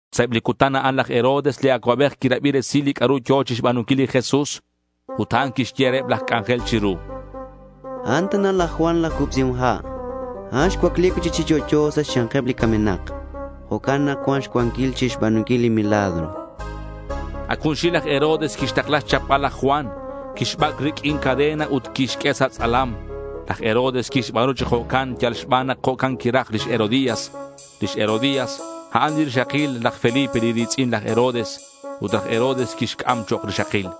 Sa' eb li cutan a'an laj Herodes li acuabej quirabi resil li c'a'ru yo̱ chixba̱nunquil li Jesús. Ut a'an quixye reheb laj c'anjel chiru: —A'an tana laj Juan laj Cubsihom Ha'. A'an xcuacli cui'chic chi yo'yo sa' xya̱nkeb li camenak. Jo'can nak cuan xcuanquil chixba̱nunquil li milagros, chan. Ac junxil laj Herodes quixtakla xchapbal laj Juan. Que'xbac' riq'uin cadena ut que'xq'ue sa' tz'alam. Laj Herodes quixba̱nu chi jo'can yal xban nak jo'can quiraj lix Herodías. Lix Herodías a'an li rixakil laj Felipe li ri̱tz'in laj Herodes. Ut laj Herodes quixc'am chok' rixakil.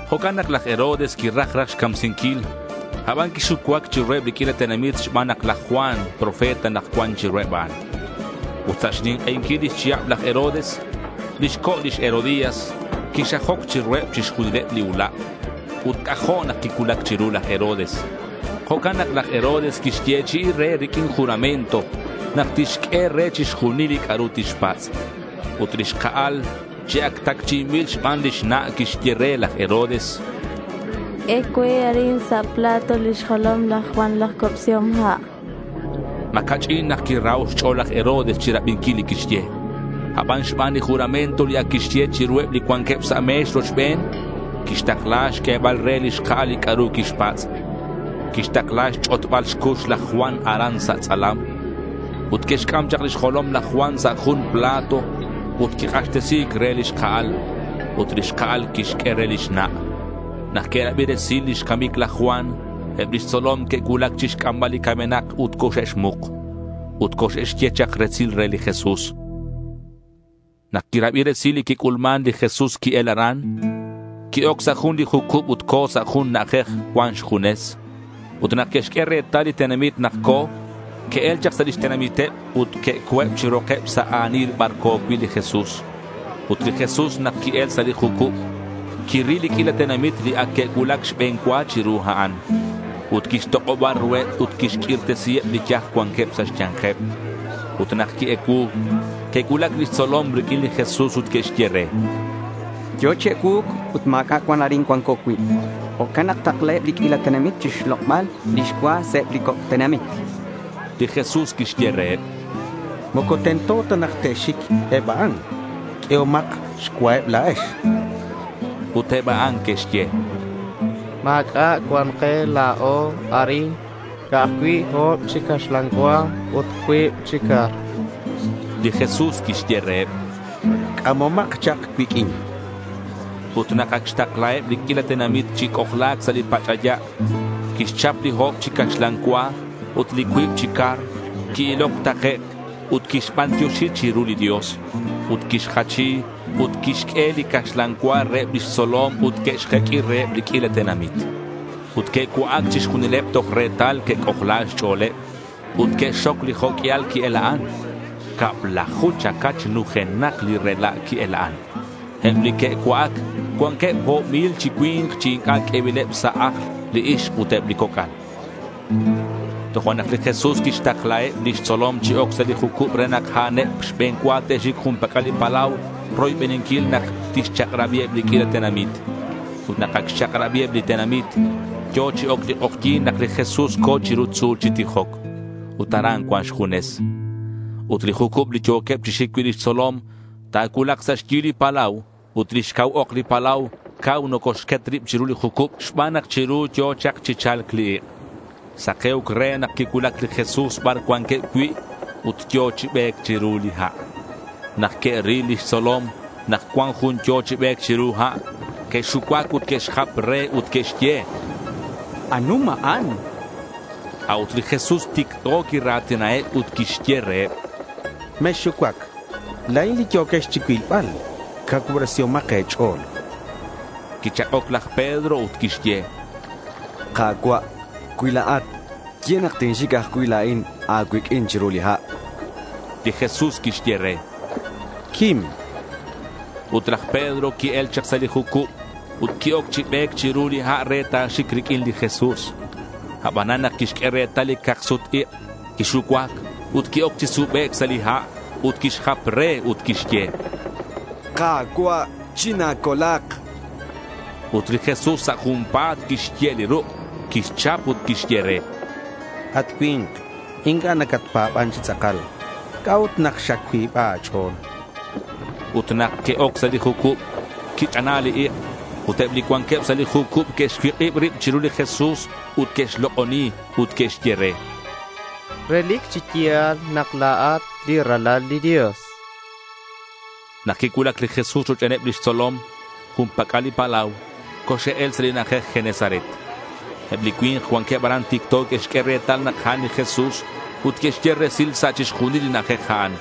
Jo'can nak laj Herodes quiraj raj xcamsinquil, aban quixucuac chiruheb li q'uila tenamit xban nak laj Juan profeta nak cuan chiruheb a'an. Ut sa' xnink'einquil lix chihab laj Herodes, lix co' lix Herodías quixajoc chiruheb chixjunileb li ula'. Ut c'ajo' nak quicuulac chiru laj Herodes. Jo'can nak laj Herodes quixyechi'i re riq'uin juramento nak tixq'ue re chixjunil li c'a'ru tixpatz'. Ut li xka'al chi ac tacchi'inbil xban lix na', quixye re laj Herodes: —Q'ue cue arin sa' plato lix jolom laj Juan laj Cubsihom Ha', chan. Ma̱ ca'ch'in nak quiraho' xch'o̱l laj Herodes chirabinquil li quixye. Aban xban li juramento li ac quixye chiruheb li cuanqueb sa' me̱x rochben, quixtakla xq'uebal re li xka'al li c'a'ru quixpatz'. Quixtakla xch'otbal xcux laj Juan aran sa' tz'alam. Ut que'xc'am chak lix jolom laj Juan sa' jun plato ut quik'axtesi̱c re li xka'al. Ut li xka'al quixq'ue re lix na'. Nak que'rabi resil lix camic laj Juan, eb lix tzolom que'cuulac chixc'ambal li camenak ut coxe'xmuk. Ut coxe'xye chak resil re li Jesús. Nak quirabi resil li quic'ulman, li Jesús qui-el aran. Qui-oc sa' jun li jucub ut co̱ sa' jun na'ajej cuan xjunes. Ut nak que'xq'ue retal li tenamit nak co̱, que'el chak sa' lix tenamiteb ut que'co̱eb chi rokeb sa' a̱nil bar co̱ cui' li Jesús. Ut li Jesús nak qui-el sa' li jucub, quiril li q'uila tenamit li ac que'cuulac xbe̱n cua chiru a'an. Ut quixtok'oba ruheb ut quixq'uirtesiheb li yaj cuanqueb sa' xya̱nkeb. Ut nak qui-ecuu, que'cuulac lix tzolom riq'uin li Jesús ut que'xye re: —Yo̱ chi ecuu̱c ut ma̱c'a' cuan arin cuanco cui'. Jo'can nak ta̱taklaheb li q'uila tenamit chixlok'bal lix cua sa' eb li coc' tenamit.— Li Jesús quixye reheb: —Moco tento ta nak te'xic eb a'an. Q'uehomak xcuaheb la̱ex.— Ut eb a'an que'xye: —Ma̱c'a' cuan ke la̱o arin, ca'aj cui' o̱b chi caxlan cua ut cuib chi car.— Li Jesús quixye reheb: —C'amomak chak cuiq'uin.— Ut nak ac xtaklaheb li q'uila tenamit chi c'ojla̱c sa' li pach'aya', quixchap li o̱b chi caxlan cua ut li cuib chi car, qui-iloc takec' ut quixbantioxi chiru li Dios. Ut quixjachi ut quixq'ue li caxlan cua reheb lix tzolom ut que'xjeq'ui reheb li q'uila tenamit. Ut que'cua'ac chixjunileb toj retal que'c'ojla xch'o̱leb. Ut que'xxoc li jo' q'uial qui-ela'an. Cablaju chacach nujenak li rela' qui-ela'an. Eb li que'cua'ac cuanqueb o̱b mil chi cui̱nk chi inc'a' q'uebileb sa' ajl li ixk ut eb li coc'al. Tojo'nak li Jesús quixtaklaheb lix tzolom chi oc sa' li jucub re nak a'aneb xbe̱n cua te'xic jun pac'al li palau roybeninquil nak tixchak'rabiheb li q'uila tenamit. Ut nak ac xchak'rabiheb li tenamit, yo̱ chi oc li k'ojyi̱n nak li Jesús co̱ chiru tzu̱l chi tijoc. Ut aran cuan xjunes. Ut li jucub li yo̱queb chi xic cui' lix tzolom ta̱cuulak sa' xyi li palau, ut lix cau ok li palau cau nocoxquet rib chiru li jucub, xban nak chiru yo̱ chak chi cha̱lc li ik'. Sake̱uc re nak quicuulac li Jesús bar cuanqueb cui' ut yo̱ chi be̱c chiru li ha'. Nak que'ril lix tzolom nak cuan jun yo̱ chi be̱c chiru ha', que'xucuac ut que'xjap re ut que'xye: —Anum a'an.— A'ut li Jesús ticto quira̱tinaheb ut quixye reheb: —Mexxucuac. La̱in li yo̱quex chicuilbal. Cacuubresihomak e̱ch'o̱l, chan reheb. Quichak'oc laj Pedro ut quixye: —Ka̱cua', cui la̱at, ye nak tinxic ajcui' la̱in a̱cuiq'uin chiru li ha'.— Li Jesús quixye re: —Quim.— Ut laj Pedro qui-el chak sa' li jucub ut qui-oc chi be̱c chiru li ha' re ta̱xic riq'uin li Jesús. Abanan nak quixq'ue retal li cak-sut-ik', quixucuac, ut qui-oc chi subec' sa' li ha' ut quixjap re ut quixye: —¡Ka̱cua', china̱colak! chan. Ut li Jesús sa' junpa̱t quixye' li ruk', quixchap ut quixye re: —At cui̱nk, inc'a' nacatpa̱ban chi tz'akal. ¿C'a'ut nak xacuiba a̱ch'o̱l?— Ut nak que'oc sa' li jucub, quich'ana li ik'. Ut eb li cuanqueb sa' li jucub que'xcuik'ib rib chiru li Jesús ut que'xlok'oni ut que'xye re: —Relic chi ya̱l nak la̱at li Ralal li Dios, chanqueb re. Nak quicuulac li Jesús rochbeneb lix tzolom jun pac'al li palau, coxe'el sa' li na'ajej Genesaret. Eb li cui̱nk cuanqueb aran ticto que'xq'ue retal nak a'an li Jesús ut que'xye resil sa' chixjunil li na'ajej a'an.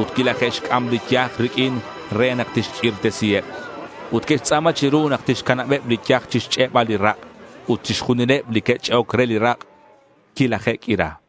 Ut quilaje'xc'am li yaj riq'uin re nak tixq'uirtesiheb. Ut que'xtz'a̱ma chiru nak tixcanabeb li yaj chixch'e'bal li rak'. Ut chixjunileb li que'ch'e'oc re li rak' quilaje'q'uira.